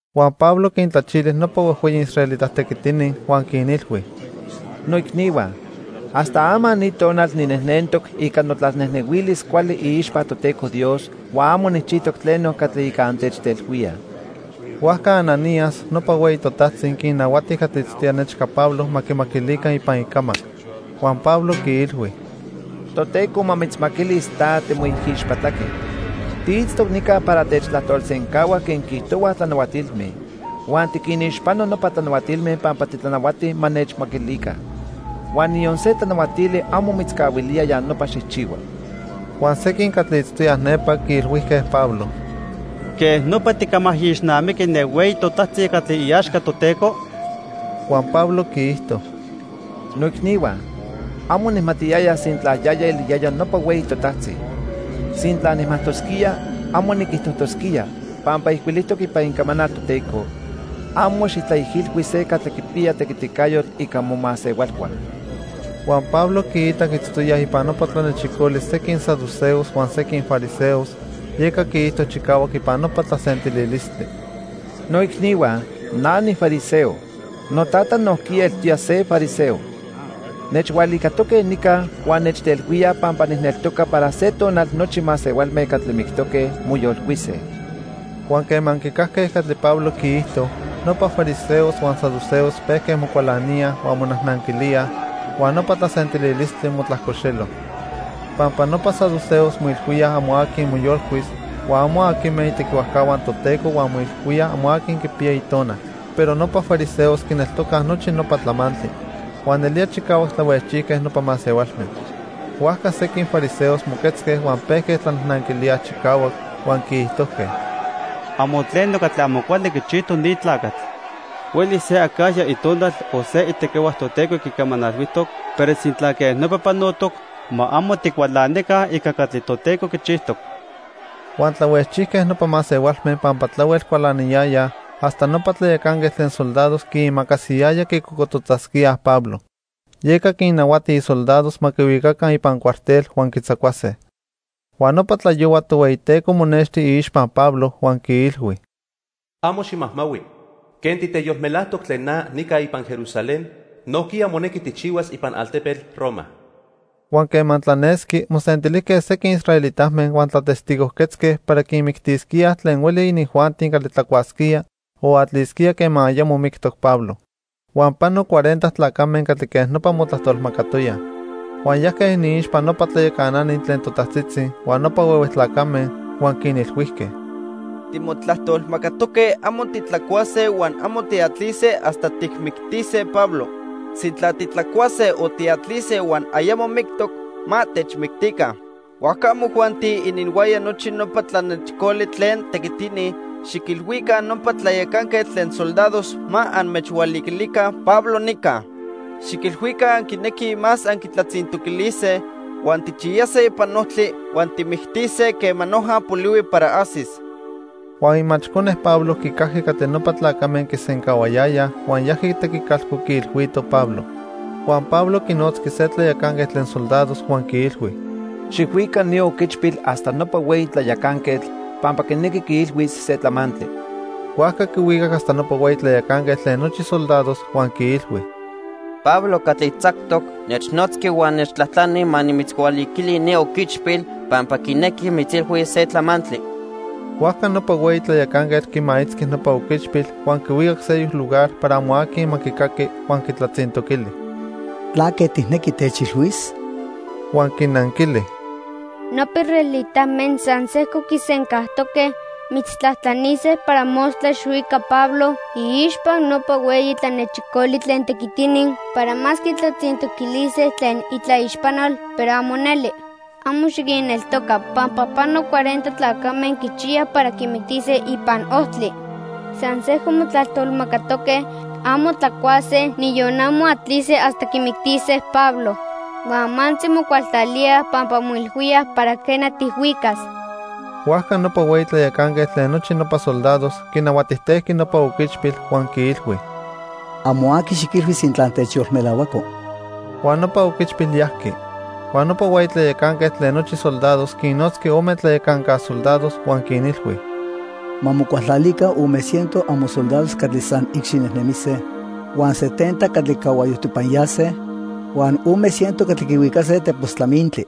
Huan Pablo quintlachili nopa huejhueyi israelita tequitini huan quinilhui: —¡Noicnihua! Hasta ama ni tonal ninejnentoc ica notlanejnehuilis cuali iixpa Toteco Dios huan amo nijchijtoc tleno catli ica antechtelhuíaj. Huajca Ananías, nopa hueyi totajtzi quinnahuati catli itztoya nechca Pablo ma quimaquilica ipan icamac. Huan Pablo quiilhui: —Toteco ma mitzmaquilis ta, timoijixpatlaquetl. Tiitztoc nica para techtlajtolsencahua quen quiijtohuaj tlanahuatilme huan tiquinixpano nopa tlanahuatilme pampa titlanahuati ma nechmaquilica. Huan niyon se tlanahuatili amo mitzcahuilía ya nopa xijchihua. Huan sequin catli itztoyaj nepa quiilhuijque Pablo: —¿Quej nopa ticamaijixnamiqui ne hueyi totajtzi catli iaxca Toteco? Huan Pablo quiijto: —Noicnihua, amo nijmatiyaya sintla yaya eliyaya nopa hueyi totajtzi. Sintla nijmajtosquía, amo niquijtojtosquía, pampa ijcuilijtoc ipan Icamanal Toteco: 'Amo xijtlaijilhui se catli quipiya tequiticayotl ica momasehualhua.' Huan Pablo quiitac itztoyaj ipan nopa tlanechicoli sequin saduceos huan sequin fariseos, yeca quiijto chicahuac ipan nopa tlasentililistli: —Noicnihua, na nifariseo. Notata nojquiya eltoya se fariseo. Nechhualicatoque nica huan nechtelhuíaj pampa nijneltoca para se tonal nochi masehualme catli mictoque, moyolcuise. Huan quema quicajque catli Pablo quiijto, nopa fariseos huan saduceos pejque mocualaníaj huan monajnanquilíaj, huan nopa tlasentililistli motlajcoxelo. Pampa nopa saduceos moilhuíaj amo aqui moyolcuis, huan amo aquime itequihuajcahua Toteco huan moilhuíaj amo aqui quipiya itonal. Pero nopa fariseos quineltocaj nochi nopa tlamantli. Huan nelía chicahuac tlahuejchijque nopa masehualme. Huajca sequin fariseos moquetzque huan pejque tlanajnanquilíaj chicahuac, huan quiijtojque: —Amo tleno catli amo cuali quichijtoc ni tlacatl. Huelis se acajya itonal o se itequihua Toteco quicamanalhuijtoc, pero sintla quej nopa panotoc, ma amo ticualanica ica catli Toteco quichijtoc. Huan tlahuejchijque nopa masehualme pampa tlahuel cualaniyayaj hasta nopa tlayacanquetl tlen soldados quiimacasiyaya quicocototzasquíaj Pablo. Yeca quinnahuati isoldados ma quihuicaca ipan cuartel huan quitzacuase. Huan nopa tlayohua Tohueyiteco monexti iixpa Pablo huan quiilhui: "Amo ximajmahui. Quen titeyolmelajtoc tlen na nica ipan Jerusalén, nojquiya monequi tijchihuas ipan altepetl Roma." Huan quema tlanesqui mosentilijque sequin israelitame huan tlatestigojquetzque para quimictisquíaj tlen hueli inijuanti catli tlacuasquía o atlisquía quema ayamo mictoc Pablo. Huan pano cuarenta tlacame catli quej nopa motlajtolmacatoyaj. Huan yajque iniixpa nopa tlayacanani tlen totajtzitzi huan nopa huehue tlacame huan quinilhuijque: —Timotlajtolmacatoque amo titlacuase huan amo tiatlise hasta tijmictise Pablo. Sintla titlacuase o tiatlise huan ayamo mictoc, ma techmictica. Huajca amojuanti ininhuaya nochi nopa tlanechicoli tlen tequitini xiquilhuica nopa tlayacanquetl tlen soldados ma anmechhualiquilica Pablo nica. Xiquilhuica anquinequij más anquitlatzintoquilise, huan tijchiyase ipan ojtli huan tijmictise quema noja polihui para ajsis. Huan imachcone Pablo quicajqui catli nopa tlacame quisencahuayayaj huan yajqui tequicalco quiilhuito Pablo. Huan Pablo quinotzqui se tlayacanquetl tlen soldados huan quiilhui: —Xijhuica ni oquichpil hasta nopa hueyi tlayacanquetl pampa quinequi quiilhuis se tlamantli. Huajca quihuicac hasta nopa hueyi tlayacanquetl tlen nochi soldados huan quiilhui: —Pablo catli tzactoc, nechnotzqui huan nechtlajtlani ma nimitzhualiquili ni oquichpil pampa quinequi mitzilhuis se tlamantli. Huajca nopa hueyi tlayacanquetl quimaitzqui nopa oquichpil huan quihuicac seyoc lugar para amo aqui ma quicaqui huan quitlatzintoquili: —¿Tlaque tijnequi techilhuis? Huan quinanquili: —Nopa israelitame san sejco quisencajtoque mitztlajtlanise para mostla xijhuica Pablo iixpa nopa hueyi tlanechicoli tlen tequitini para más quitlatzintoquilise tlen itlaixpanol, pero amo neli. Amo xiquinneltoca pampa pano cuarenta tlacame quichiyaj para quimictise ipan ojtli. San sejco motlajtolmacatoque amo tlacuase, niyon amo atlise, hasta quimictise Pablo. Huan amantzi mocualtlalíaj pampa moilhuíaj para quena, tijhuicas. Huajca nopa hueyi tlayacanquetl tlen nochi nopa soldados quinahuatijtejqui nopa oquichpil huan quiilhui: —Amo aqui xiquilhui sintla techyolmelahuaco. Huan nopa oquichpil yajqui. Huan nopa hueyi tlayacanquetl tlen nochi soldados quinnotzqui ome tlayacanca soldados huan quinilhui: —Ma mocualtlalica ome ciento amosoldados catli san icxinejnemise, huan setenta catli cahuayojtipanyase huan ome ciento catli quihuicase tepos tlamintli.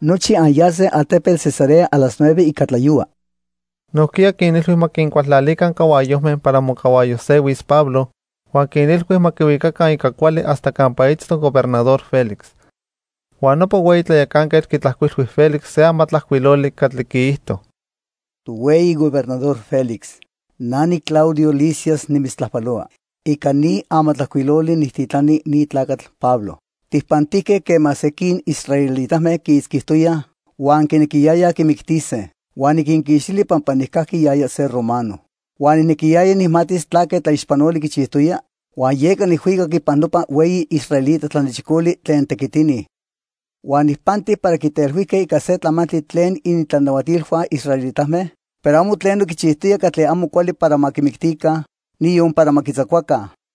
Nochi anyase altepetl Cesarea a las nueve ica tlayohua. Nojquiya quinilhui ma quincualtlalica cahuayojme para mocahuayojsehuis Pablo, huan quinilhui ma quihuicaca ica cuali hasta campa itztoc Gobernador Félix. Huan nopa hueyi tlayacanquetl quitlajcuilhui Félix se amatlajcuiloli catli quiijto: Tohueyi Gobernador Félix, na niClaudio Lisias nimitztlajpalohua. Ica ni amatlajcuiloli nijtitlani ni tlacatl Pablo. Tijpantijque quema sequin israelitame quiitzquitoyaj huan quinequiyayaj quimictise. Huan niquinquixtili pampa nijcajqui yaya se romano. Huan nijnequiyaya nijmatis tlaque tlaixpanoli quichijtoya huan yeca nijhuicac ipan nopa hueyi israelita tlanechicoli tlen tequitini. Huan nijpanti para quitelhuijque ica se tlamantli tlen inintlanahuatilhua israelitame, pero amo tleno quichijtoya catli amo cuali para ma quimictica, niyon para ma quitzacuaca.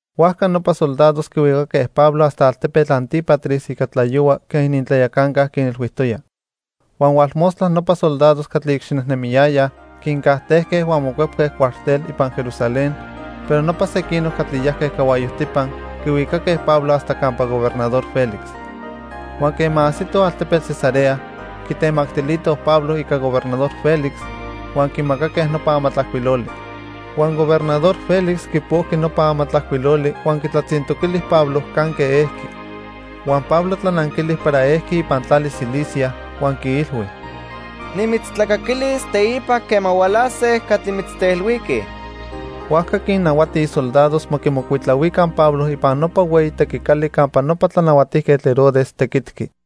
Huajca nopa soldados quihuicaque Pablo hasta altepetl Antípatris ica tlayohua quen inintlayacanca quinilhuijtoya. Huan hualmostla nopa soldados catli icxinejnemiyayaj quincajtejque huan mocuepque cuartel ipan Jerusalén, pero nopa sequinoc catli yajque cahuayojtipa quihuicaque Pablo hasta campa Gobernador Félix. Huan quema ajsitoj altepetl Cesarea, quitemactilitoj Pablo ica Gobernador Félix, huan quimacaque nopa amatlajcuiloli. Huan Gobernador Félix quipojqui nopa amatlajcuiloli huan quitlatzintoquili Pablo canque ejqui. Huan Pablo tlananquili para ejqui ipan tlali Cilicia, huan quiilhui: —Nimitztlacaquilis teipa quema hualase catli mitztelhuiquij. Huajca quinnahuati isoldados ma quimocuitlahuica Pablo ipan nopa hueyi tequicali campa nopa Tlanahuatijquetl Herodes tequitqui.